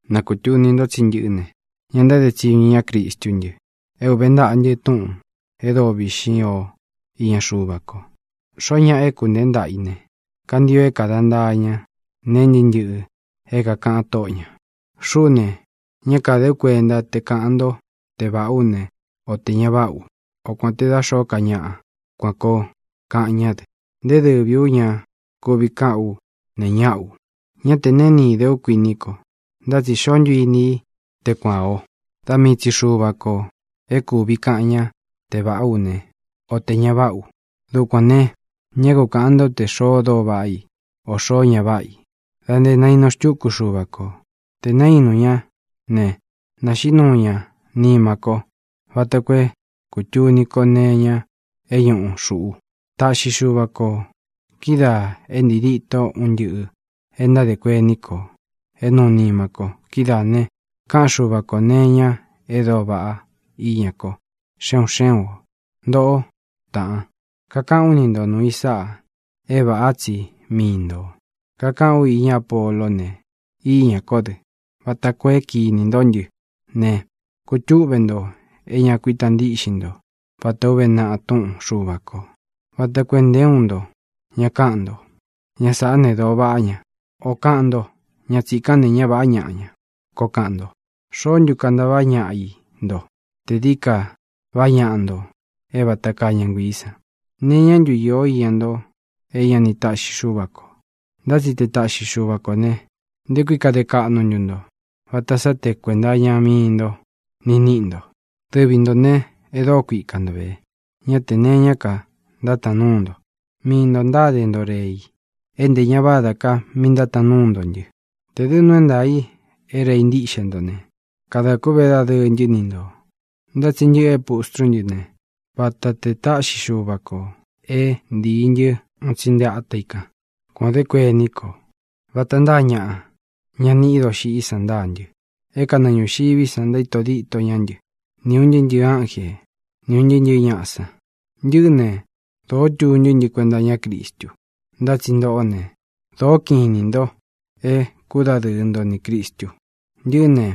Na kūtuni nto tsí ntɨꞌɨ́ ne, ña ntáde tsiñu iña Cristú ntɨ, é uvē ntaꞌa ntɨ túꞌūn e dóo viꞌxín o iña Xuva ko. Xoó ñaꞌa é kūnteé ntaꞌa i ne, kantio é kāda ntaa ña nee ntɨ́ꞌɨ ntɨꞌɨ é kākaꞌan tóꞌo ñā. Xuꞌú ne, ñá kāde ú kuentá te kāꞌan ntó te vāꞌá u ne, o tē ña váꞌa u, o kuān te dá xōó ka ñaꞌa kuan koo kaꞌan ñá dɨ. Nté dɨvī ú ña kuvi káꞌan u neé ñaꞌa u. Ña te neé ni idé u, kuini ko, ntá tsi xoó ntu ini í te kuan ō. Da mii tsi Xuva kō é kuvi kaꞌan ñá te vāꞌá u ne, o te ña váꞌa u. Dukuān ne, ñá ku kāꞌan ntó te xoo dóo vaꞌa i, ō xoo ña váꞌa i, da nté nainu xtúku Xúva kō. Tē naínu ñá ne, naxiꞌí nuu ña nima ko vata koo é kūtuni ko nee iña é ñuꞌu xūꞌu. Taꞌxi Xuva ko kídaā é ntii díto un ntɨꞌɨ̄ é ntádē kuení kō é nuu nima ko. Kidáā ne, kaꞌan Xúva kō nee iña e dóo vaꞌá iña ko, xe un xé un ō. Ntoꞌó, taꞌan, kakaꞌán u ni nto nuū i sáꞌā e váꞌa tsi mii ntō. Kakaꞌán u iñá Apoló ne, íñā kó dɨ, vata koo é kīni nto ntɨ́ ne, kutúꞌve nto é ña kuita ntíꞌxin nto vatā ó uve naꞌa túꞌun Xuva kō, vata koo é nté uun nto ña káꞌan nto: “Ña sāꞌá ne, dōo váꞌa ña”, ō kaꞌan nto: “Ña tsīkán ne, ñá vāꞌá ñaꞌa ña”, koo kaꞌan nto. ¿Xoó ntu kantaváꞌa ñaꞌa i nto te dií ka vaꞌá ñaꞌa nto é vata kaa ña nguiī san? ¿Nee iñá ntu īo íña nto é ña ni taꞌxi Xuva ko? Ntá tsi te taꞌxi Xuva kō ne, ¿nté kui kade kaꞌnu ntu nto vata sá tē kuenta iña mii nto ni níꞌi nto? Dɨvi ntō ne, é dōó kuika nto vē; ñá tē nee iñá ka ntátaan núu nto. Mii ntō ntáde nto rei, é ntē ñá vādá ka míꞌi ntátaan núu nto ntɨ. Tē dɨ́ nuu é ntaā i é rei ntíꞌxe nto ne, kadā kûꞌvé dadɨɨ ntɨ́ ni ntō. Ntá tsi ntɨꞌɨ é pustrú ntɨ ne, vata te taꞌxi Xuva kō é ntīi ntɨ un tsi nte ata i kan. Kuan ō dé kuení ko. Vata ntáa ñaꞌa, ña niꞌi i doxiꞌí san ntáa ntɨ, é kanɨɨ ñūxiví san ntaíto díto ña ntɨ́, ni ūn ntɨɨ́ ntɨ̄ɨ ánje, ni ūn ntɨɨ́ ntɨ̄ɨ́ ñaꞌa san. Ntɨꞌɨ́ ne, dōó tuntú ntɨ kuenta iña Cristu. Ntá tsi ntoꞌó ne, dōó kiꞌin inī nto é kudadɨɨ nto nī Cristu. Ntɨꞌɨ́ ne,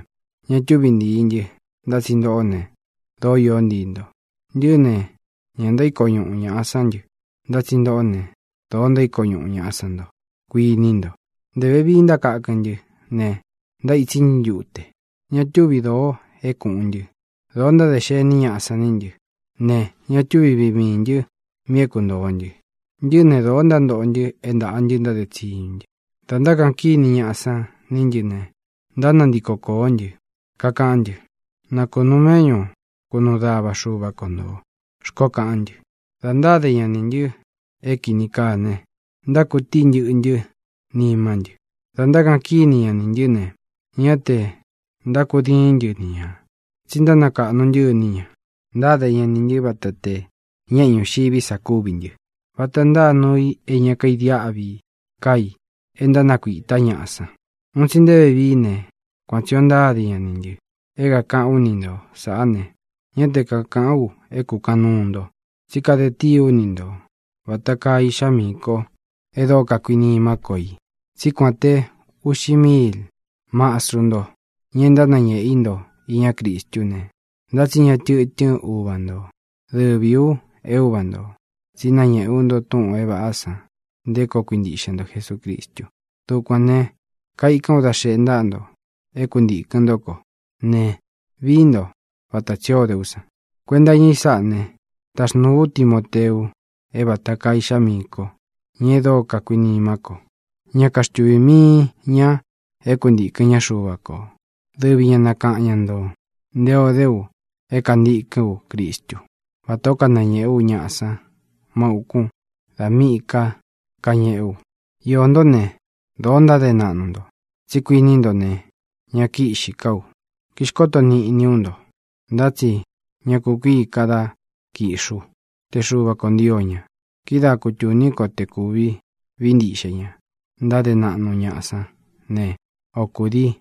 ña túvi ntīi ntɨ́, ntá tsi ntoꞌó ne, dóo iō ntíi nto. Ntɨꞌɨ́ ne, ña ntaíko ñuꞌu ñaꞌa sán ntɨ, ntá tsi ntoꞌó ne, dōo ntaíko ñuꞌu ñāꞌa san nto, kuíni nto. Ntē vevii ntákakɨn ntɨ́ ne, ntaítsí ntɨ ntute. Ña túvi dōo é kūꞌun ntɨ. Dōo ntádē xení ñaꞌa san ní ntɨ ne, ña túvi viꞌi miī ntɨ́ mi é kuntōo ntɨ. Ntɨꞌɨ́ ne, dōó ntántoꞌo ntɨ é ntaꞌa ntɨ ntáde tsiñu ntɨ́. Dā ntákaꞌan kíni ñaꞌa san ní ntɨ ne, ntánantiko kōó ntɨ, kakaꞌán ntɨ: “Na kunūu méꞌñu kunuu dava Xuva ko ntō”, xkoó kaꞌán ntɨ. Dā ntáde ña nī ntɨ é kīni kaa ne, ntákutíi ntɨꞌɨ ntɨ́ nimá ntɨ. Dā ntákaꞌan kíni ña nī ntɨ́ ne, ñá tē ntákudiín ntɨ ni ñā, tsi ntánakaꞌnu ntɨ́ iní ñā. Ntáde ña nī ntɨ́ vata te ñeꞌe ñuxiví sa kúvi ntɨ, vata ntáa nuu i é ña kaidiáꞌvi ká i e ntánakuītá ñaꞌa san. Un tsi nté vevií ne, kuan tsī ó ntáde ña nī ntɨ. É kakāꞌán u ni ntō saꞌá ne, ñá te kakāꞌán u é kūkaꞌan nuu nto, tsí kade tii ú ni ntō vata kaa iꞌxá miī ko e dóo kakuinimá ko i. Tsí kuan te uꞌxi míil mastru nto, ña é ntánañéꞌe í nto iñá Cristú ne, ntá tsi ña tɨtɨ́n uva ntō. Dɨvī u é uva ntō, tsí nañéꞌe ú nto túꞌūn é vāꞌá san nté koo kuintiꞌxe nto Jesūcristu. Dukuān ne, kaikán u da xeꞌe ntáꞌa nto é kuntīkɨn ntó ko ne, viī ntó vata tsī ó de ú san. Kuenta iña i sáꞌa ne, taxnūu ú Timoteu, é vata kaa iꞌxá miī ko, ña e dóo kakuinimá ko. Ñá kaxtuvī mii ña é kuntīkɨn ñá Xuva kō. Dɨvi ñā nakaꞌan ñá ntō nté o dé u é kantīkɨ́n u Cristú, vatā ó kanañēꞌé u ñaꞌa san má ūkún dā míꞌī ka kañeꞌé u. Iō ntó ne, dōo ntáde naꞌnu nto, tsí kuini nto ne, ña kíꞌxī ká u, kíxkoto niꞌni ú nto. Ntá tsi ña kukuíi ka dá kiꞌxi ú, te Xuva kō ntio ña. Kidáa kutūní ko te kūvi vií ntiꞌxe ña ntáde naꞌnu ñaꞌa sán ne, o kūdii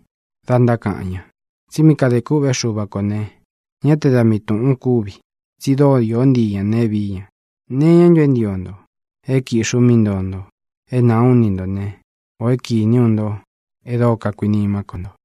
da ntákaꞌan ña. Tsi mí kadē kûꞌvé Xuva kō ne, ñá te da mii tūꞌun kúvi, tsi dóo iō ntii ña neé viī ña. ¿Nee iñá ntu é ntio nto: é kīꞌxi ú mí ntoo nto é nāa ú ni ntō né, ō é kīní u nto e dóo kakuinimá ko nto?